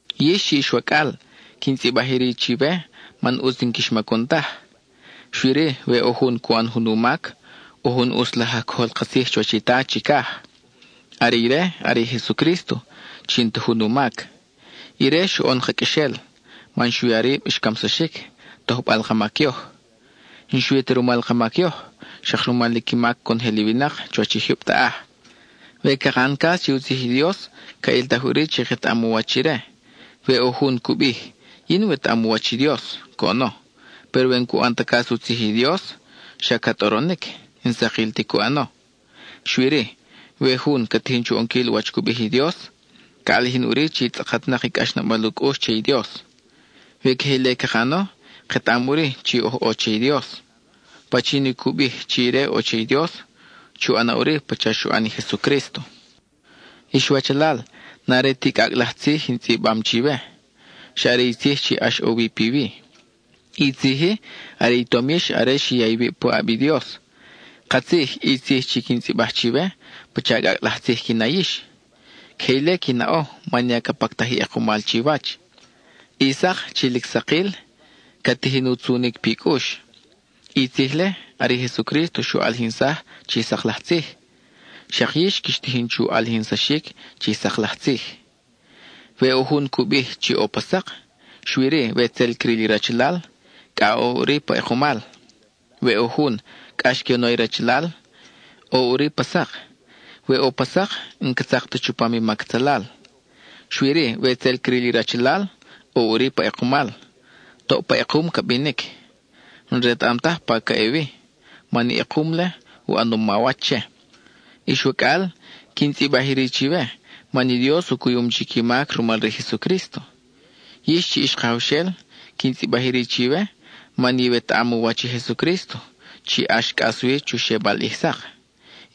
Yix chi ix wacʼal, quin tzʼibaj iri chiwe man ʼutz n-quix macun taj. Xui-ri, we ʼo jun cu ʼan jun u mac, ʼo jun ʼutz laj aj cojol ka tzij chuwach i Ta chicaj. Are ire are i Jesucrísto, chi n-ta jun u mac. Ire xoʼon ka qʼuexel, man xu ya rib xcamsaxic, tojbal ka mac yoj. N-xui ta rumal ka mac yoj, xak rumal i qui mac conojel i winak chuwach i jyub taʼaj. We caka ʼan cas che u tzij i Dios, ca ʼiltaj ʼuri chi ketaʼam u wach ire. We ʼo jun cu bij: “Yin wetaʼam u wach i Dios,” coʼono, péro we n-cu ʼan ta cas u tzij i Dios, xa ca tʼoronic; n-sakil ti cu ʼano. Xui-ri, we jun ca tijin chu ʼonquil wach cu bij i Dios, ca ʼalijin ʼuri chi tzʼakatnak i cʼaxnabal u cʼux che i Dios. We queje ile caka ʼano, ketaʼam ʼuri chi oj ʼo che i Dios. Pachin i cu bij chi ire ʼo che i Dios, chu ʼana ʼuri pacha xu ʼan i Jesucrísto. Ix wachalal, n-are ti cʼacʼ laj tzij in tzʼibam chiwe, xa are i tzij chi ʼax ʼo wi piwi. I tzij-i are i tom yix are xi ya iwib puʼab i Dios. Katzij, i tzij chi quin tzʼibaj chiwe, pacha cʼacʼ laj tzij qui na yix. Queje ile qui naʼo man ya ca pactaj i ʼekumal chiwach; i sak chi lic sakil, ca tijin u tzunic pi cʼux. I tzij-le, are i Jesucrísto xu ʼalijinsaj chi sak laj tzij, xak yix quix tijin chu ʼalijinsaxic chi sak laj tzij. We ʼo jun cu bij chi ʼo pa sak, xui-ri we tzel cril i rachalal, cʼa ʼo ʼuri pa ʼekumal. We ʼo jun, cʼax que u na i rachalal, ʼo ʼuri pa sak; we ʼo pa sak, n-ca tzak ta chupam i mac atzalal. Xui-ri we tzel cril i rachalal, ʼo ʼuri pa ʼekumal; toʼ pa ʼekum ca binic. N-retaʼam taj pa ca ʼe wi, man i ʼekum-le u ʼanom mawach che. Ix wacʼal, quin tzʼibaj iri chiwe, man i Dios u cuyum chic i mac rumal re i Jesucrísto. Yix chi ix kajawxel, quin tzʼibaj iri chiwe, man iwetaʼam u wach i Jesucrísto, chi ʼax cʼas wi chu xebal ʼij sak.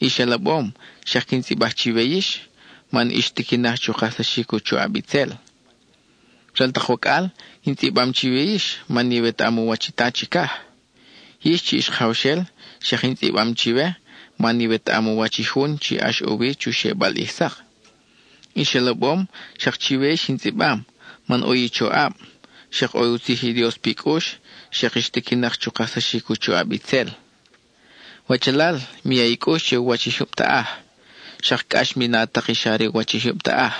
Ix alabom, xak quin tzʼibaj chiwe yix, man ix tiquinak chu kajsaxic u choʼab itzel. Ral tak wacʼal, in tzʼibam chiwe yix man iwetaʼam u wach i Ta chicaj. Yix chi ix kajawxel, xak in tzʼibam chiwe, man iwetaʼam u wach i Jun chi ʼax ʼo wi chu xebal ʼij sak. Ix alabom, xak chiwe yix in tzʼibam man ʼo i choʼab, xak ʼo i u tzij i Dios pi cʼux, xak ix tiquinak chu kajsaxic u choʼab itzel. Wachalal, mi ya i cʼux che u wach i jyub taʼaj, xak cʼax mi na tak i xa re u wach i jyub taʼaj.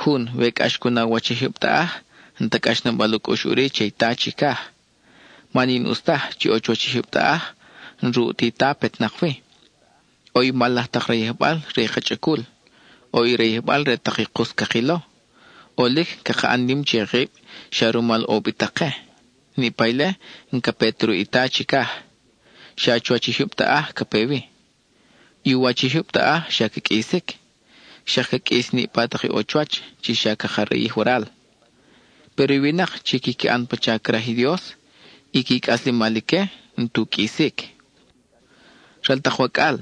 Jun, we cʼax cu na u wach i jyub taʼaj, n-ta cʼaxnabal u cʼux ʼuri che i Ta chicaj. Man i n-ʼus taj chi ʼo chuwach i jyub taʼaj, n-ruʼ ti Ta petnak wi. ʼO i mal laj tak rayijbal re i ka chʼacul; ʼo i rayijbal re tak i kus cakilo; ʼolic caka ʼan nim che kib xa rumal ʼo ubitak ke. Niʼpa ile n-ca pe ta ruʼ i Ta chicaj; xa chuwach i jyub taʼaj ca pe wi. I u wach i jyub taʼaj xa ca qʼuisic. Xak ca qʼuis i niʼpa tak ʼo chuwach chi xa caka rayij waral. Péro i winak chi quiqui ʼan pacha craj i Dios, i qui cʼaslemal ique n-tu qʼuisic. Ral tak wacʼal,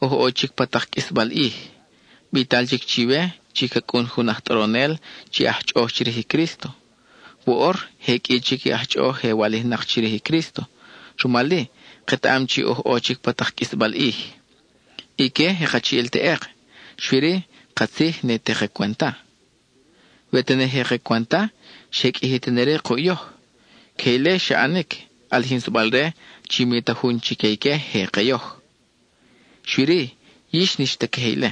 oj ʼo chic pa tak qʼuisbal ʼij. Bital chic chiwe chi ca cʼun jun aj tʼoronel chi aj chʼoʼoj chirij i Crísto. Woʼor, je qʼui chic i aj chʼoʼoj je walijnak chirij i Crísto, rumal-i, ketaʼam chi oj ʼo chic pa tak qʼuisbal ʼij. Ique je kachiʼil teʼek, xui-ri katzij, ne te ka cwenta. We tene je ka cwenta, xe qʼuiji tene-ri kuʼ yoj. Queje ile xa ʼanic, ʼalijinsabal-re chi mi ta jun chique ique je ke yoj. Xui-ri, yix n-ix ta queje ile;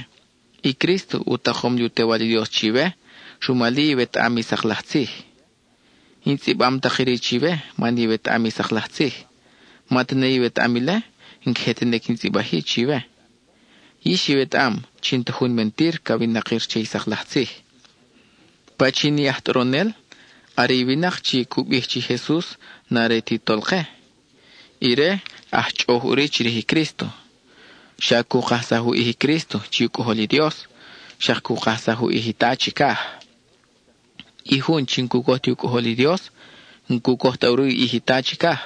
i Crísto u takom li u Tewal i Dios chiwe, rumal-i iwetaʼam i sak laj tzij. In tzʼibam tak iri chiwe man iwetaʼam i sak laj tzij. Ma tene iwetaʼam ile, n-queje tene quin tzʼibaj-i chiwe. Yix iwetaʼam chi n-ta jun mentir ca winakir che i sak laj tzij. ¿Pachin i aj tʼoronel? Are i winak chi cu bij chi Jesus n-are ti Tolke; ire aj chʼoʼoj ʼuri chirij i Crísto. Xa cu kajsaj u ʼij i Crísto chi u Cʼojol i Dios, xak cu kajsaj u ʼij i Ta chicaj. I jun chi n-cu coj ti u ʼij u Cʼojol i Dios, n-cu coj ta ʼuri u ʼij i Ta chicaj;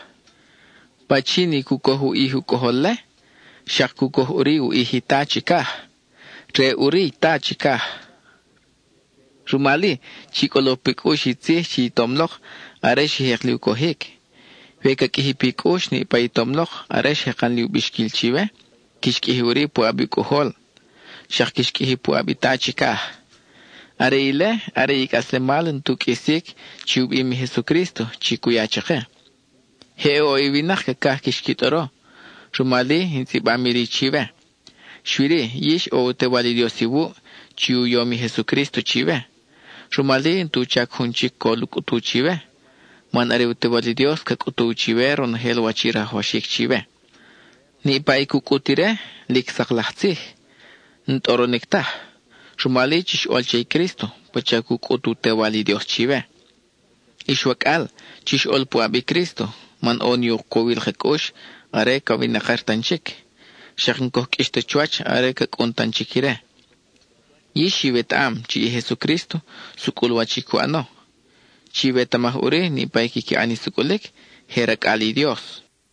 pachin i cu coj u ʼij u Cʼojol-le, xak cu coj ʼuri u ʼij i Ta chicaj, re ʼuri i Ta chicaj. Rumal-i, chi cʼolo pi cʼux i tzij chi i tom lok are xi jek li u cojic. We ca qʼuiji pi cʼux niʼpa i tom lok are xjekan li u bixquil chiwe, quix qʼuiji ʼuri puʼab u Cʼojol, xak quix qʼuiji puʼab i Ta chicaj. Are ile are i cʼaslemal n-tu qʼuisic chi u bim i Jesucrísto chi cu ya chake. Je ʼo i winak cacaj quix qui tʼoro, rumal-i in tzʼibam iri chiwe. Xui-ri, yix ʼo i u Tewal i Dios iwuʼ, chi u yom i Jesucrísto chiwe. Rumal-i n-tu chac jun chic col u cʼutu chiwe, man are u Tewal i Dios ca cʼutuw chiwe ronojel wach i rajwaxic chiwe. Niʼpa i cu cʼut ire, lic sak laj tzij, n-tʼoronic taj. Rumal-i, chix ʼol che i Crísto pacha cu cʼut u Tewal i Dios chiwe. Ix wacʼal, chix ʼol puʼab i Crísto, man ʼo ni u cowil ka cʼux are ca winakir tan chic, xak n-coj qʼuix ta chuwach are ca cʼun tan chic ire. Yix iwetaʼam chi i Jesucrísto, sucʼul wach i cu ʼano; chiwetamaj ʼuri niʼpa i quiqui ʼan i sucʼulic, je racʼal i Dios.